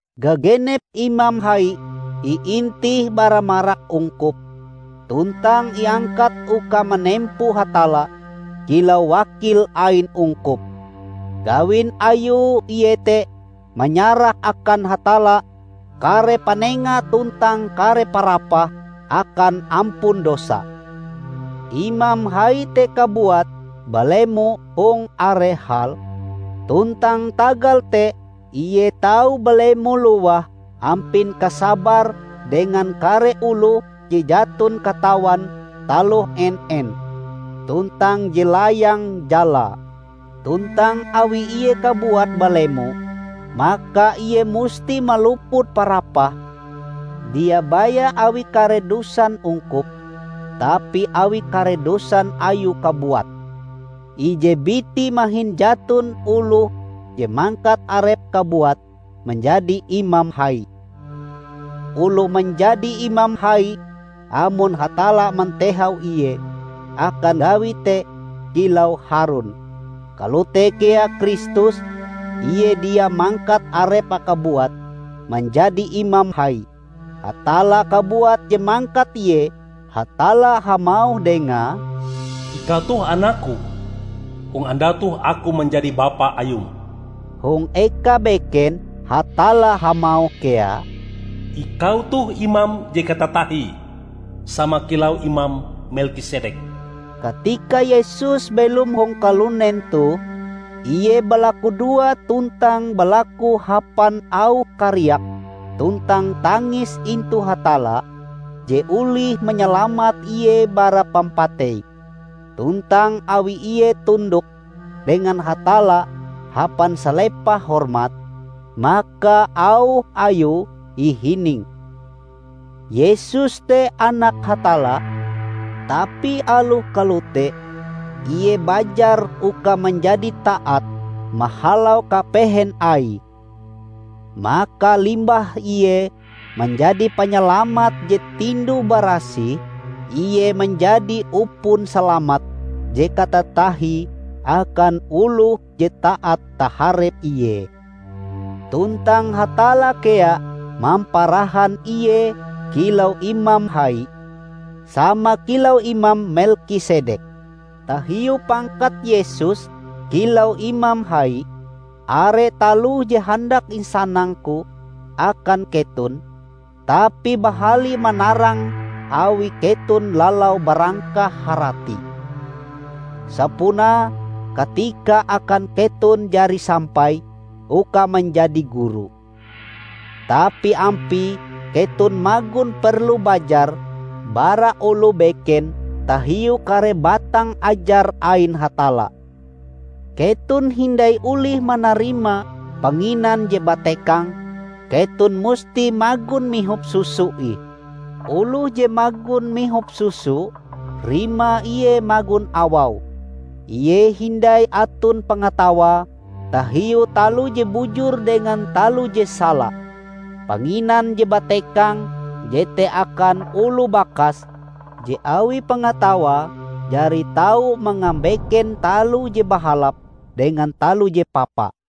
Gagenep imam hai iintih bara marak ungkup, tuntang iangkat uka manempo Hatalla kilau wakil ain ungkup. Gawin ayue iete manyarah akan Hatalla kare panenga tuntang kare parapah akan ampun dosa. Imam hai te kabuat balemo hong are hal, tuntang tagal te ie tau balemo lowah ampin kasabare dengan kare oloh je jaton katawan taloh en-en tuntang je layang jalae. Tuntang awi ie kabuat balemo, maka ie musti maluput parapah, dia baya awi kare dosan ungkup, tapi awi kare dosan ayue kabuat. Ije biti mahin jaton oloh je mangkat arepe kabuat manjadi imam hai. Oloh manjadi imam hai amon Hatalla mantehau ie akan gawi te -- kilau Harun. Kalote kea Kristus. Ie dia mangkat Arepe kabuat manjadi Imam Hai. Hatalla kabuat je mangkat Ie. Hatalla hamauh Dengae, "Ikau toh Anak-Ku; hong andau toh Aku manjadi Bapa Ayum." Hong eka beken Hatalla hamauh kea, "Ikau toh imam je katatahie, sama kilau imam Melkisedek." Katika Yesus belom hong kalunen toh, Ie balakudoa tuntang balaku hapan auh kariak tuntang tangis intu Hatalla, je olih manyalamat Ie bara pampatei. Tuntang awi Ie tundok dengan Hatalla hapan salepah hormat, maka auh Ayue ihining. Yesus te Anak Hatalla, tapi aloh kalote, Ie bajar uka manjadi taat mahalau kapehen Aie. Maka limbah Ie manjadi panyalamat je tinduh-barasih, Ie manjadi upon salamat je katatahie akan oloh je taat taharep Ie, tuntang Hatalla kea mamparahan Ie kilau Imam Hai, sama kilau imam Melkisedek! Tahiu pangkat Yesus kilau Imam Hai, are taloh je handak insanangku akan keton, tapi bahali manarange awi keton lalau barangkah haratie. Sapunae katikae akan keton jari sampai uka manjadi guru, tapi ampie keton magon perlu bajar bara oloh beken tahiu kare batang ajar ain Hatalla. Keton hindai olih manarima panginan je batekang; keton musti magon mihop susu ih. Oloh je magon mihop susu, rimae ie magon awau; ie hindai aton pangatawae tahiu taloh je bujur dengan taloh je sala. Panginan je batekang jete akan oloh bakas je awi pangatawae, jari tau mangabeken taloh je bahalap dengan taloh je papa.